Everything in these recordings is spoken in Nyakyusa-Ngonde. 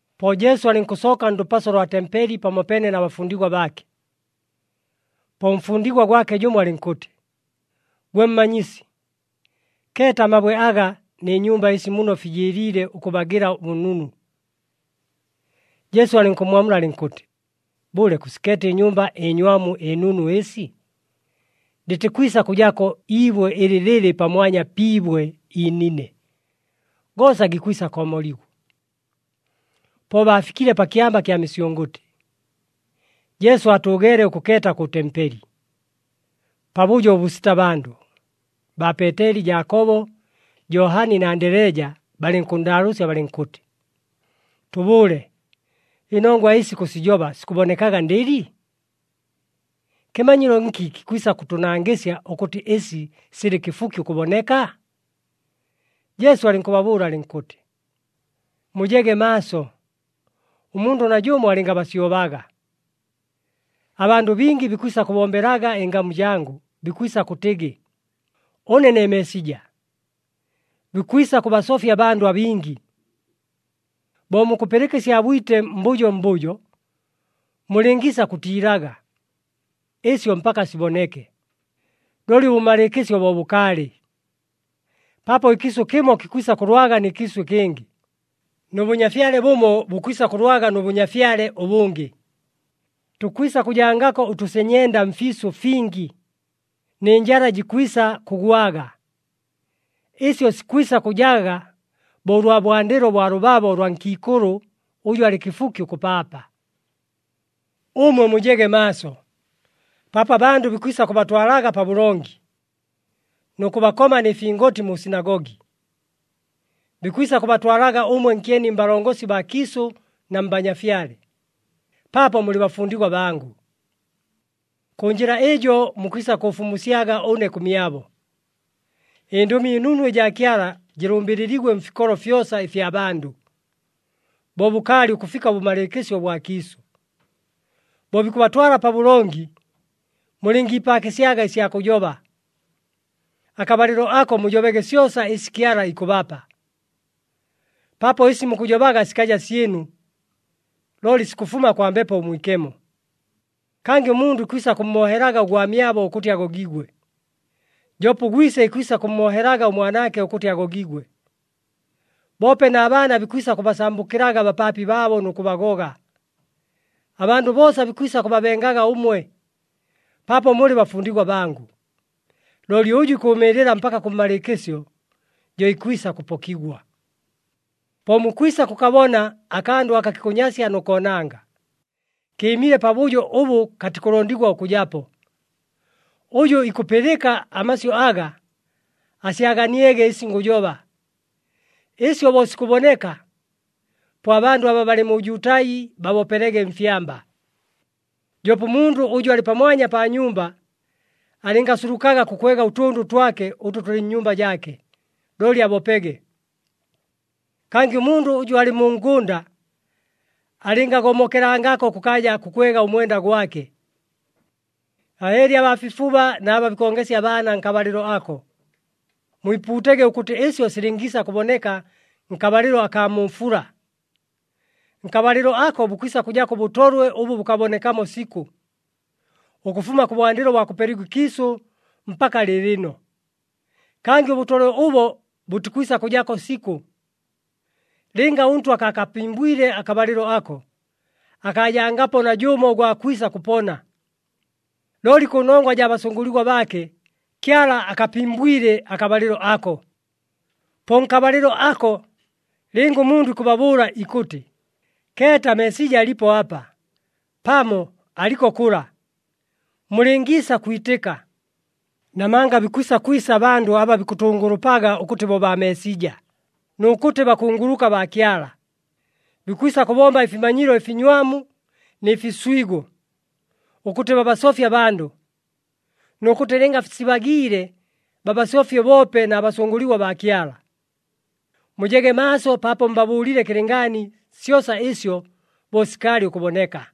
Po Jesu alɨnkʉsooka ndʉpaso lwa tempeli pamopeene na bafundigwa baake. Po ʉmfundigwa gwake jʉmo alɨnkʉtɨ, “Gwe Mmanyisi, keeta amabwe aga nɨ nyumba ɨsi muno fijɨɨliile ʉkʉbagɨla ʉbʉnunu!” Jesu alɨnkʉmmwamula alɨnkʉtɨ, “Bʉle, kʉsikeeta ɨnyumba ɨnywamu ɨnunu ɨsi? Lɨtikwisa kʉjako iibwe ɨlɨ lɨlɨ pamwanya pi ibwe iinine. Goosa gikwisa koomoligwa!” Po baafikile pa Kyamba kya Misyʉngʉtɨ, Jesu aatʉʉgeele ʉkʉkeeta kʉ tempeli. Pabʉjo ʉbʉsita bandʉ, baa Peeteli, Jaakobo, Johani na Andeleja balɨnkʉnndaalʉʉsya balɨnkʉtɨ, “Tʉbʉʉle, ɨnongwa ɨsi kʉsijoba sikʉbonekaga ndɨli? Kɨmanyilo nki kikwisa kʉtʉnangɨsya ʉkʉtɨ ɨsi silɨ kɨfuki ʉkʉboneka?” Jesu alɨnkʉbabʉʉla alɨnkʉtɨ, “Mujege maaso, ʉmundʉ najʉmo alɨngabasyobaga. Abandʉ bingi bikwisa kʉbombelaga ɨngamu jangʉ, bikwisa kʉtɨgɨ, ‘Ʉne ne Meesija!’ Bikwisa kʉbasofya abandʉ abingi. Bo mukʉpɨlɨka ɨsya bwite mbʉjo mbʉjo, mulɨngiisa kʉtiilaga. Ɨsyo mpaka siboneke, looli ʉbʉmalɨɨkɨsyo bo bʉkaalɨ. Paapo ɨkiisʉ kɨmo kikwisa kʉlwaga nɨ kiisʉ ɨkɨngɨ, nʉ bʉnyafyale bʉmo bukwisa kʉlwaga nʉ bʉnyafyale ʉbʉngɨ. Tukwisa kʉjangako ʉtʉsenyenda mfiisʉ fingi, nɨ njala jikwisa kʉgwaga. Ɨsyo sikwisa kʉjaga bo ʉlwa bwandɨlo bwa lʉbabo lwa nkiikʉlʉ ʉjʉ alɨ kɨfuki ʉkʉpaapa. “Ʉmwe mujege maaso, paapo abandʉ bikwisa kʉbatwalaga pabʉlongi, nʉ kʉbakoma nɨ fingoti mu sinagogi. Bikwisa kʉbatwalaga ʉmwe nkyeni mbalongosi baa kiisʉ na mbanyafyale, paapo mulɨ bafundigwa bangʉ. Kʉ njɨla ɨjo mukwisa kʉʉfumusyaga ʉne kʉmyabo. ƗNdʉmi ɨNunu ɨjaa Kyala jɨlʉmbɨlɨligwe mfikolo fyosa ɨfya bandʉ, bo bʉkaalɨ ʉkʉfika ʉbʉmalɨɨkɨsyo ʉbwa kiisʉ. Bo bikʉbatwala pabʉlongi, mulɨngiipaakɨsyaga ɨsya kʉjoba. Akabalɨlo ako mujobege syosa ɨsi Kyala ikʉbapa, paapo ɨsi mukʉjobaga sikaja syɨnu, looli sikʉfuma kwa Mbepo Mwikemo. Kangɨ ʉmundʉ ikwisa kʉmmoohelaga ʉgwamyabo ʉkʉtɨ agogigwe, joope ʉgwise ikwisa kʉmmoohelaga ʉmwanaake ʉkʉtɨ agogigwe. Boope na baana bikwisa kʉbasambʉkɨlaga abapaapi baabo nʉ kʉbagoga. Abandʉ boosa bikwisa kʉbabengaga ʉmwe, paapo mulɨ bafundigwa bangʉ. Looli ʉjʉ ikʉʉmɨɨlɨla mpaka kʉmmalɨɨkɨsyo, jo ikwisa kʉpokigwa. “Po mukwisa kʉkabona, ‘Akandʉ aka kikʉnyasya nʉ koonanga,’ kɨɨmile pabʉjo ʉbʉ katikʉlondigwa ʉkʉjapo. Ʉjʉ ikʉpɨlɨka amasyʉ aga, asyaganiege ɨsi ngʉjoba. Ɨsyo bo sikʉboneka, po abandʉ aba balɨ mu Jutai babopelege mfyamba. Joope ʉmundʉ ʉjʉ alɨ pamwanya pa nyumba, alɨngasulukaga kʉkwega ʉtʉndʉ twake ʉtʉ tʉlɨ nnyumba jaake, looli abopege. Kangɨ ʉmundʉ ʉjʉ alɨ mu ngʉnda alɨngagomokelangako kʉkaaja kʉkwega ʉmwenda gwake. Ahɨɨli abaa fifuba na aba bikongesya abaana nkabalɨlo ako! Mwipuutege ʉkʉtɨ ɨsyo silɨngiisa kʉboneka nkabalɨlo akaa mu fula. Nkabalɨlo ako bukwisa kʉjako ʉbʉtolwe ʉbʉ bʉkabonekamo sikʉ, ʉkʉfuma kʉbwandɨlo bwa kʉpeligwa ɨkiisʉ mpaka lɨɨlɨno. Kangɨ ʉbʉtolwe ʉbo bʉtikwisa kʉjako sikʉ. Lɨnga ʉNtwa akaakapimbwile akabalɨlo ako, akaajangapo najʉmo ʉgwa kwisa kʉpona. Looli kʉnongwa jaa basʉngʉligwa baake, Kyala akapimbwile akabalɨlo ako. “Po nkabalɨlo ako, lɨnga ʉmundʉ ikʉbabʉʉla ikʉtɨ, ‘Keeta, Meesija alipo apa!’ pamo, ‘Aliko kʉla!’ mulɨngiisa kwitɨka. Namanga bikwisa kwisa abandʉ aba bikʉtʉngʉlʉpaga ʉkʉtɨ bo baa Meesija, nʉ kʉtɨ bakunguluka baa Kyala. Bikwisa kʉbomba ɨfimanyilo ɨfinywamu nɨ fiswigo, ʉkʉtɨ babasofye abandʉ, nʉ kʉtɨ lɨnga sibagiile babasofye boope na basʉngʉligwa baa Kyala. Mujege maaso paapo mbabʉʉlile kɨlɨngaani syosa ɨsyo bo sikaalɨ ʉkʉboneka!”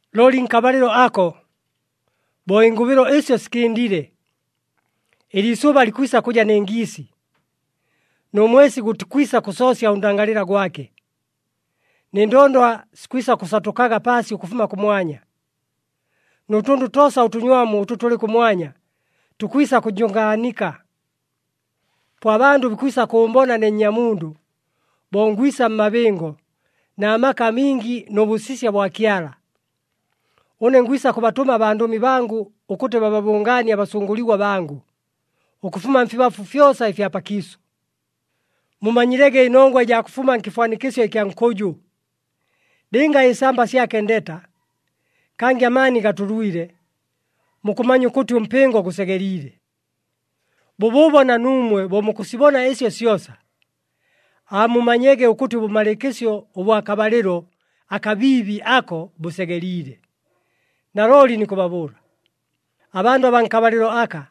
“Looli nkabalɨlo ako, bo ɨngʉbɨlo ɨsyo sikɨndile, ‘Ɨliisʉba likwisa kʉja nɨ ngiisi, nʉ mwesi gʉtikwisa kʉsoosya ʉndangalɨla gwake, nɨ ndondwa sikwisa kʉsatʉkaga paasi ʉkʉfuma kʉmwanya. Nʉ tʉndʉ toosa ʉtʉnywamu ʉtʉ tʉlɨ kʉmwanya, tukwisa kʉjʉngaanika.’ “Po abandʉ bikwisa kʉʉmbona ne Nnyamundʉ, bo ngwisa mmabɨngo na maka amingi nʉ bʉsisya bwa Kyala. Ʉne ngwisa kʉbatʉma abandʉmi bangʉ ʉkʉtɨ bababʉngaanie abasʉngʉligwa bangʉ, ʉkʉfuma mfibafu fyosa ɨfya pakiisʉ. “Mumanyilege ɨnongwa ɨjaa kʉfuma nkɨfwanikɨsyo ɨkya nkʉjʉ. Lɨnga ɨsamba syake ndeta, kangɨ amaani gatʉlwile, mukʉmanya ʉkʉtɨ ʉmpɨngo gʉsegeliile. Bʉbʉʉbo na nuumwe bo mukʉsibona ɨsyo syosa, aamumanyege ʉkʉtɨ ʉbʉmalɨɨkɨsyo ʉbwa kabalɨlo akabiibi ako bʉsegeliile. Nalooli nikʉbabʉʉla, abandʉ abaa nkabalɨlo aka,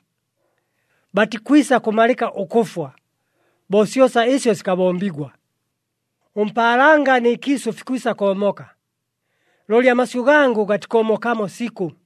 batikwisa kʉmalɨka ʉkʉfwa, bo syosa ɨsyo sikabombigwa. Ʉmpaalanga nɨ kiisʉ fikwisa koomoka, looli amasyʉ gangʉ gatikoomokamo sikʉ.”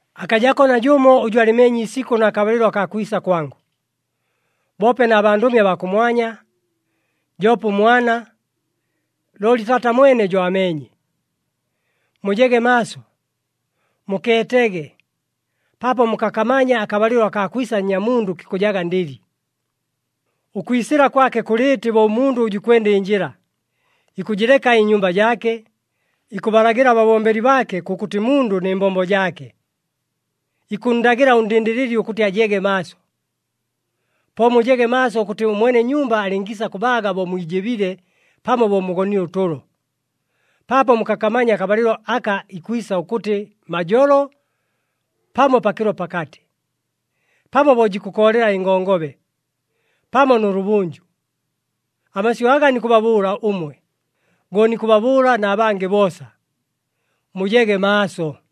“Akajako najʉmo ʉjʉ alɨmeenye iisikʉ na kabalɨlo akaa kwisa kwangʉ, boope na bandʉmi abaa kʉmwanya, joope ʉMwana, looli Taata mwene jo ameenye. Mujege maaso, mukeetege, paapo mukakamanya akabalɨlo akaa kwisa Nnyamundʉ kikʉjaga ndɨli. Ʉkwisɨla kwake kʉlɨɨtɨ bo ʉmundʉ ʉjʉ ikwenda ɨnjɨla, ikʉjɨleka ɨnyumba jaake, ikʉbalagɨla ababombeli baake kʉkʉtɨ mundʉ nɨ mbombo jaake, ikʉnndagɨla ʉndɨndɨlɨli ʉkʉtɨ ajege maaso. Po mujege maaso, ʉkʉtɨ ʉmwene nyumba alɨngiisa kʉbaaga bo mwijɨbile pamo bo mugonile ʉtʉlo. Paapo mukakamanya akabalɨlo aka ikwisa ʉkʉtɨ majolo, pamo pakɨlo pakatɨ, pamo bo jikʉkoolela ɨngongobe, pamo nʉlʉbʉnjʉ. Amasyʉ aga nikʉbabʉʉla ʉmwe, go nikʉbabʉʉla na bangɨ boosa. Mujege maaso!”